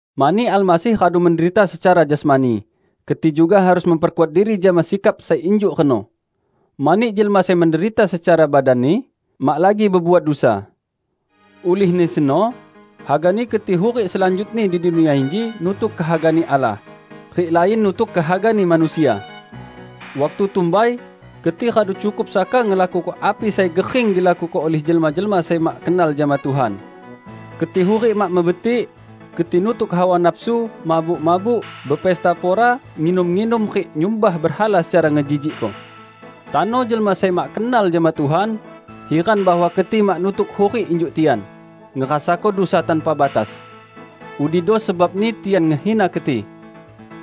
Mani Almasih radu menderita secara jasmani, keti juga harus memperkuat diri jama sikap sai injuk reno. Mani jelma sai menderita secara badanni, mak lagi bebuat dusa. Ulihni seno, hagani keti hurik selanjutni di dunia inji nutuk kehaga-Ni Allah, rik lain nutuk kehagani manusia. Waktu tumbai, keti radu cukup saka ngelakuko api sai gering dilakuko ulih jelma-jelma sai mak kenal jama Tuhan. Keti hurik mak mebetik. Keti nutuk hawa nafsu, mabuk-mabuk, bepesta pora, nginum-nginum rik nyumbah berhala secara ngejijikko. Tano jelma sai mak kenal jama Tuhan, hiran bahwa keti mak nutuk hurik injuk tian, ngerasako dusa tanpa batas. Udido sebabni tian ngehina keti.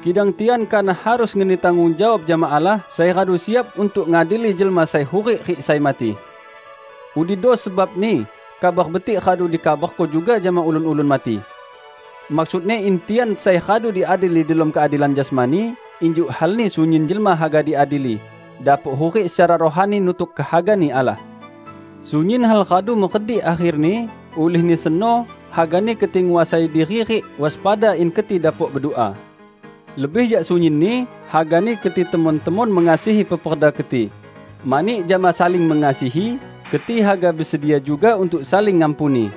Kidang tian kanah harus ngeni tanggung jawab jama Allah sai radu siap untuk ngadili jelma sai hurik rik sai mati. Udido sebabni Kabar Betik radu dikabarko juga jama ulun-ulun mati. Maksudni in tian, sai radu diadili delom keadilan jasmani -- injuk halni sunyin jelma haga diadili -- dapok hurik secara rohani nutuk kehaga-Ni Allah. Sunyin hal radu meredik akherni, ulihni seno hagani keti nguasai diri rik waspada in keti dapok bedua. Lebih jak sunyinni, hagani keti temon-temon mengasihi peperda keti, mani jama saling mengasihi keti haga besedia juga untuk saling ngampuni.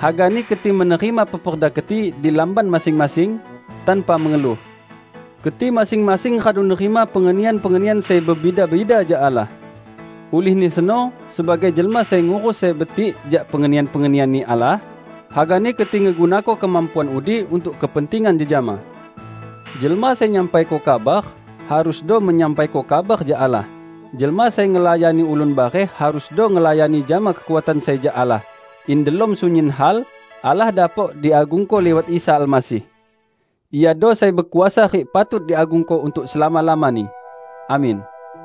Hagani keti menerima peperda keti di lamban masing-masing, tanpa mengeluh. Keti masing-masing radu nerima pengenian-pengenian sai bebida-bida jak Allah. Ulihni seno sebagai jelma sai ngurus sai betik jak pengenian-pengenian-Ni Allah, hagani keti ngegunako kemampuan udi untuk kepentingan jejama. Jelma sai nyampaiko kabar, harusdo menyampaiko kabar jak Allah; jelma sai ngelayani ulun bareh harusdo ngelayani jama kekuatan sai jak Allah, in delom sunyin hal, Allah dapok diagungko liwat Isa Almasih. Iado sai bekuasa rik patut diagungko untuk selama-lamani. Amin.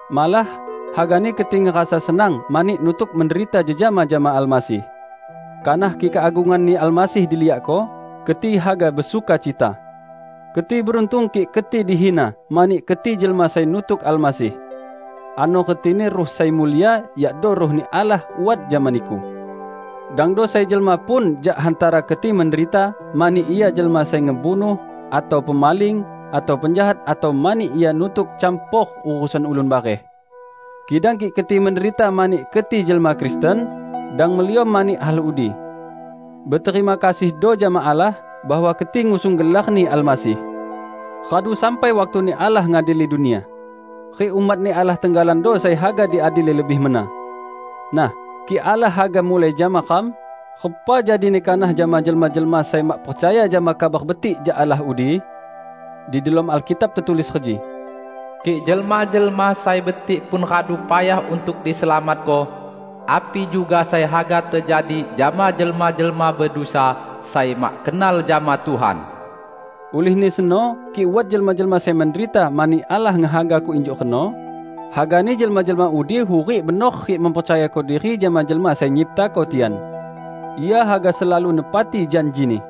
Malah, hagani keti ngerasa senang mani nutuk menderita jejama jama Almasih. Kanah kik keagungan-Ni Almasih diliakko, keti haga besukacita. Keti beruntung kik keti dihina mani keti jelma sai nutuk Almasih. Ano retini Ruh sai mulia, yakdo Ruh-Ni Allah, wat jama niku. Dangdo sai jelma pun jak hantara keti menderita mani ia jelma sai ngebunuh, atau pemaling, atau penjahat atau mani ia nutuk campor urusan ulun bareh. Kidang kik keti menderita mani keti jelma Kristen, dang meliom mani hal udi. Beterima kasihdo jama Allah, bahwa keti ngusung gelar-Ni Almasih. Radu sampai waktuni Allah ngadili dunia. Rik umat-Ni Allah tenggalando sai haga diadili lebih mena. Nah, kik Allah haga mulai jama ram, repa jadini kanah jama jelma-jelma sai mak percaya jama Kabar Betik jak Allah udi? Di delom Alkitab tetulis reji, "Kik jelma-jelma sai betik pun radu payah untuk diselamatko, api juga sai haga tejadi jama jelma-jelma bedusa sai mak kenal jama Tuhan!" Ulihni seno kik wat jelma-jelma sai menderita mani Allah ngehagako injuk reno, hagani jelma-jelma udi hurik benor rik mempercayako diri jama Jelma Sai Nyiptako tian. Ia haga selalu nepati janji-Ni.